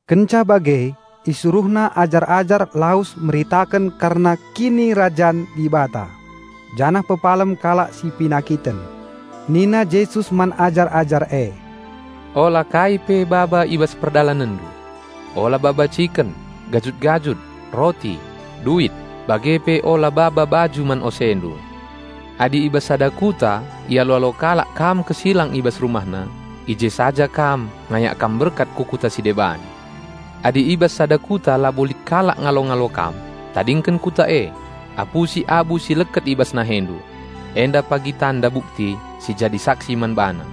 Kenca bage IsuruhNa ajar-ajar lawes meritaken kerna Kinirajan Dibata, janah pepalem kalak si penakiten. Nina Jesus man ajar-ajar e, "Ola kai pe baba i bas perdalanenndu, ola baba ciken, gajut-gajut, roti, duit, bage pe ola baba baju man osendu. Adi i bas sada kuta ialo-alo kalak kam kesilang i bas rumahna, i je saja kam ngayak kam berkat ku kuta si deban. Adi i bas sada kuta labo lit kalak ngalo-ngalo kam, tadingken kuta e, apusi abu si leket i bas nahendu. Enda pagi tanda bukti si jadi saksi man bana."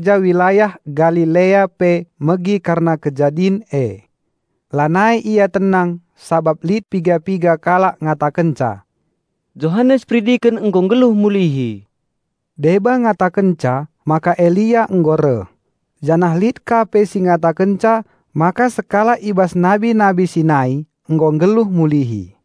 Herodes raja wilayah Galilea pe megi kerna kejadin e. Lanai ia tenang sabap lit piga-piga kalak ngatakenca, "Johanes Peridiken nggo nggeluh mulihi!" Deba ngatakenca maka Elia nggo reh, janah lit ka pe si ngatakenca maka sekalak i bas nabi-nabi si nai nggo nggeluh mulihi.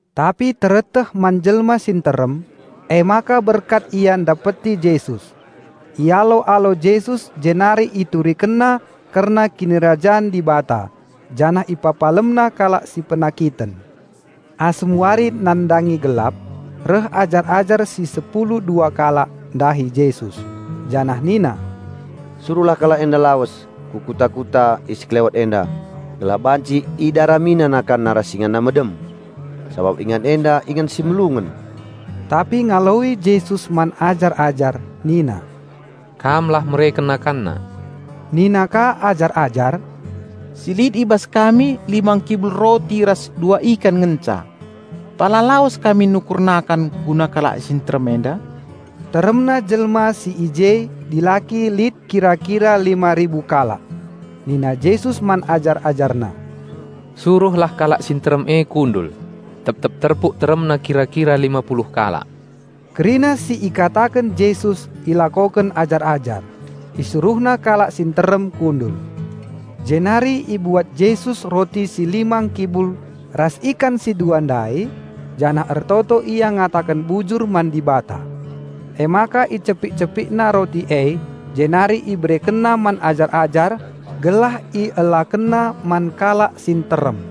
Tapi tereteh man jelma si nterem, emaka berkat ia ndapeti Jesus. Ialo-alo Jesus jenari IturikenNa kerna Kinirajan Dibata janah IpepalemNa kalak si penakiten. Asum wari nandangi gelap, reh ajar-ajar si sepulu dua kalak ndahi Jesus, janah nina, "Suruhlah kalak enda lawes ku kuta-kuta i sekelewet enda gelah banci idaramina nakanna ras inganna medem, sabap ingan enda ingan si melungen." Tapi ngaloi Jesus man ajar-ajar nina, "Kam lah mereken nakanna." Nina ka ajar-ajar, "Si lit i bas kami lima ngkibul roti ras dua ikan ngenca. Pala lawes kami nukur nakan guna kalak si nterem enda?" Teremna jelma si i je dilaki lit kira-kira lima ribu kalak. Nina Jesus man ajar-AjarNa, "Suruhlah kalak si nterem e kundul, tep-tep terpuk teremna kira-kira lima puluh kalak." Kerina si ikataken Jesus ilakoken ajar-ajar, isuruhna kalak si nterem kundul. Jenari ibuat Jesus roti si lima ngkibul ras ikan si dua ndai, janah ertoto Ia ngataken bujur man Dibata. Emaka icepik-CepikNa roti e jenari IberekenNa man ajar-ajar gelah ielakenna man kalak si nterem.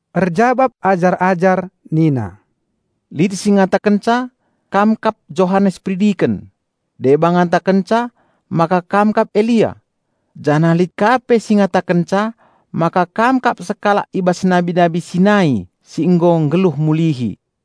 Erjabap ajar-ajar nina, "Lit si ngatakenca Kam kap Johanes Peridiken. Deba ngatakenca maka Kam kap Elia. Janah lit ka pe si ngatakenca maka Kam kap sekalak i bas nabi-nabi si nai si nggo nggeluh mulihi."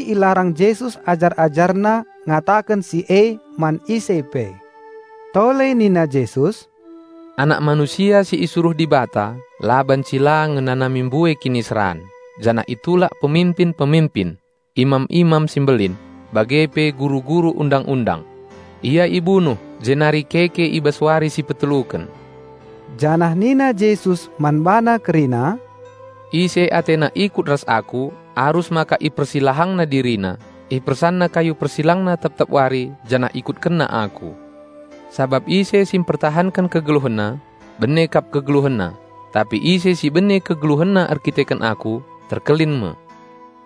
Jenari ilarang Jesus ajar-AjarNa ngkataken si e man ise pe. Tole nina Jesus, "Anak Manusia si isuruh Dibata la banci la ngenanami mbue kiniseran, janah itulak peminpin-peminpin, imam-imam si mbelin, bage pe guru-guru Undang-undang. Ia ibunuh jenari keke i bas wari si peteluken." Janah nina Jesus man bana kerina, "Ise atena ikut ras Aku arus maka ipersilahangna dirina, ipersanna kayu persilangna tep-tep wari janah ikutkenna Aku. Sabap ise si mpertahanken kegeluhenna, bene kap kegeluhenna, tapi ise si bene kegeluhenna erkiteken Aku terkelin me.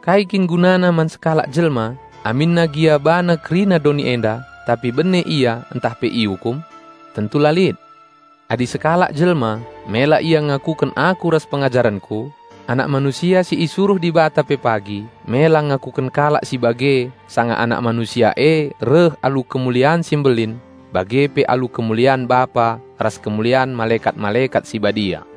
Kai kin gunana man sekalak jelma aminna gia bana kerina doni enda tapi bene ia ntah pe iukum? Tentu la lit! Adi sekalak jelma mela ia ngakuken Aku ras pengajarenKu, Anak Manusia si isuruh Dibata pe pagi mela ngakuken kalak si bage sanga Anak Manusia e reh alu kemulian si mbelin bage pe alu kemulian Bapa ras kemulian malekat-malekat si badia.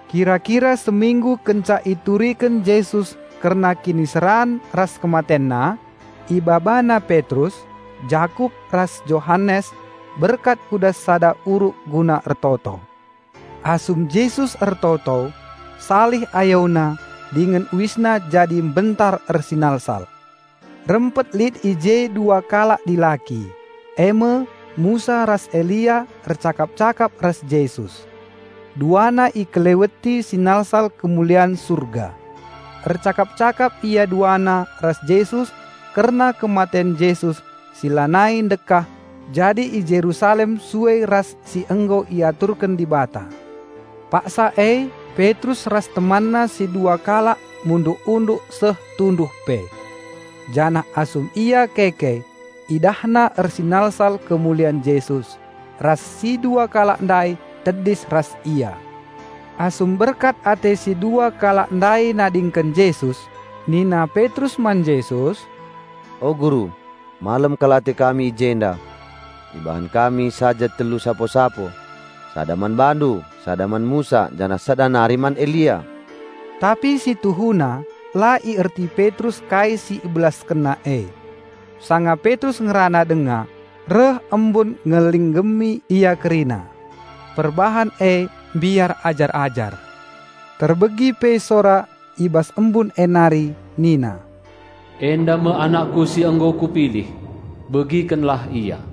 Kira-kira seminggu kenca ituriken Jesus kerna kiniseran ras KematenNa, IbabaNa Petrus, Jakup ras Johanes berkat ku das sada uruk guna ertoto. Asum Jesus ertoto, salih AyoNa dingen UisNa jadi mbentar ersinalsal. Rempet lit i je dua kalak dilaki, e me Musa ras Elia ercakap-cakap ras Jesus. Duana ikeleweti sinalsal kemulian Surga. Ercakap-cakap ia duana ras Jesus kerna kematen Jesus si lanai ndekah jadi i Jerusalem sue ras si nggo iaturken Dibata. Paksa e Petrus ras temanna si dua kalak munduk-unduk seh tunduh pe. Janah asum ia keke idahna ersinalsal kemulian Jesus, ras si dua kalak ndai tedis ras Ia. Asum berkat ate si dua kalak ndai nadingken Jesus nina Petrus man Jesus, "O Guru! Malem kal ate kami i jenda. Ibahan kami saja telu sapo-sapo, sada man BaNdu, sada man Musa, janah sada nari man Elia." (Tapi si tuhuna la ierti Petrus kai si ibelaskenna e.) Sanga Petrus ngerana denga, reh embun ngelinggemi ia kerina. Perbahan e mbiar ajar-ajar. Terbegi pe sora i bas embun e nari nina, "Enda me AnakKu si nggo Kupilih. Begikenlah Ia."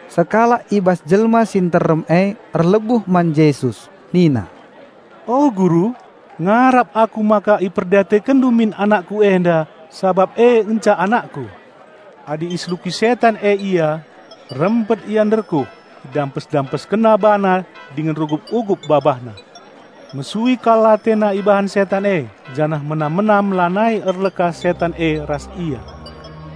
Sekalak i bas jelma si nterem e erlebuh man Jesus nina, "O, Guru! Ngarap aku maka IperdiatekenNdu min anakku enda, sabap e ngenca anakku. Adi iseluki setan e ia, rempet ia nderkuh, idampes-dampeskenna bana dingen rugup-ugup babahna. Mesui kal atena ibahan setan e janah menam-menam lanai erleka setan e ras ia.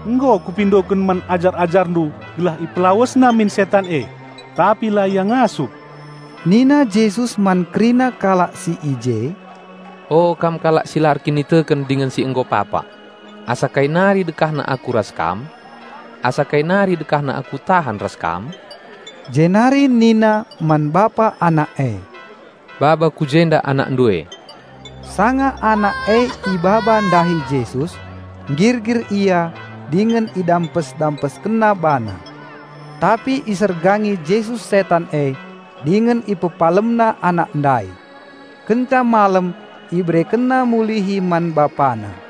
Nggo kupindoken man ajar-AjarNdu gelah ipelawesna min setan e, tapi la ia ngasup." Nina Jesus man kerina kalak si i je, "O, kam kalak si la erkiniteken dingen si nggo papak, asa kai nari dekahna Aku ras kam? Asa kai nari dekahna Aku tahan ras kam?" Jenari nina man bapa anak e, "Baba kujenda anakndu e." Sanga anak e ibaba ndahi Jesus, nggirgir ia dingen idampes-dampeskenna bana. Tapi isergangi Jesus setan e dingen IpepalemNa anak ndai. Kenca malem IberekenNa mulihi man bapana.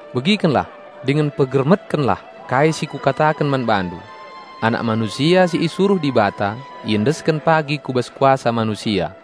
"Begikenlah dingen pegermetkenlah kai si Kukataken man bandu. Anak Manusia si isuruh Dibata iendesken pagi ku bas kuasa manusia."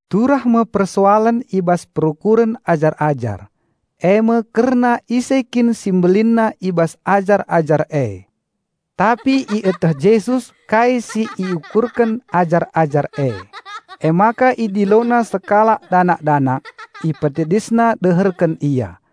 Turah me persoalen i bas perukuren ajar-ajar, e me kerna ise kin si mbelinna i bas ajar-ajar e. Tapi ieteh Jesus kai si iukurken ajar-ajar e, emaka IdiloNa sekalak danak-danak, IpetedisNa deherken Ia,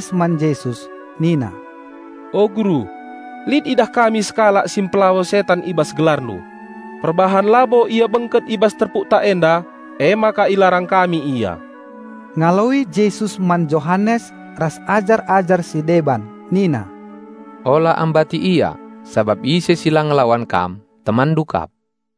Emaka ngaloi Johanes man Jesus nina, "O, Guru, lit idah kami sekalak si mpelawes setan i bas GelarNdu. Perbahan labo ia bengket i bas terpukta enda, emaka ilarang kami ia." Ngaloi Jesus man Johanes ras ajar-ajar si deban nina, "Ola ambati ia, sabap ise si la ngelawan kam, temanndu kap."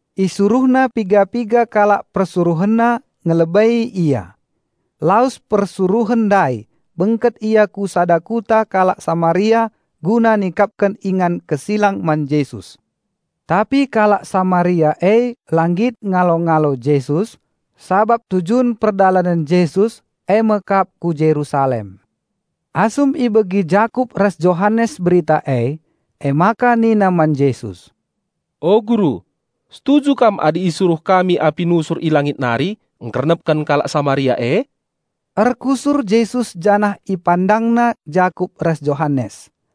Isuruhna piga-piga kalak PersuruhenNa ngelebei Ia. Lawes persuruhen ndai, bengket ia ku sada kuta kalak Samaria guna nikapken ingan kesilang man Jesus. Tapi kalak Samaria e la nggit ngalo-ngalo Jesus, sabap tujun perdalanen Jesus e me kap ku Jerusalem. Asum ibegi Jakup ras Johanes berita e, emaka nina man Jesus, "O Guru, setuju Kam adi isuruh kami api nusur i langit nari ngkernepken kalak Samaria e?" Erkusur Jesus janah IpandangNa Jakup ras Johanes.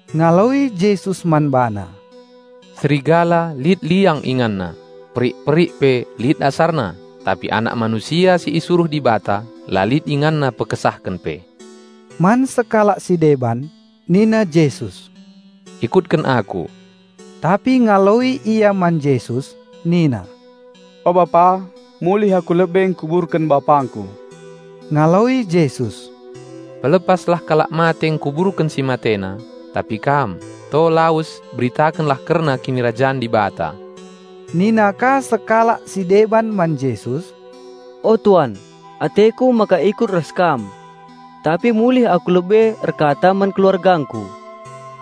Ngaloi Jesus man bana, "Serigala lit liang inganna, perik-perik pe lit asarna, tapi Anak Manusia si isuruh Dibata la lit InganNa pekesahken pe." Man sekalak si deban nina Jesus, "Ikutken Aku." Tapi ngaloi ia man Jesus nina, "O Bapa, mulih aku lebe ngkuburken bapangku." Ngaloi Jesus, "Pelepaslah kalak mate ngkuburken si matena; tapi kam, to lawes beritakenlah kerna Kinirajan Dibata." Nina ka sekalak si deban man Jesus, "O Tuan, ateku maka ikut ras Kam, tapi mulih aku lebe erkata man keluargangku."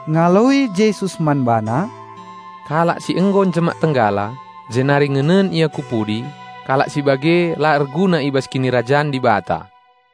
Ngaloi Jesus man bana, "Kalak si nggo njemak tenggala, jenari ngenen ia ku pudi, kalak si bage la erguna i bas Kinirajan Dibata."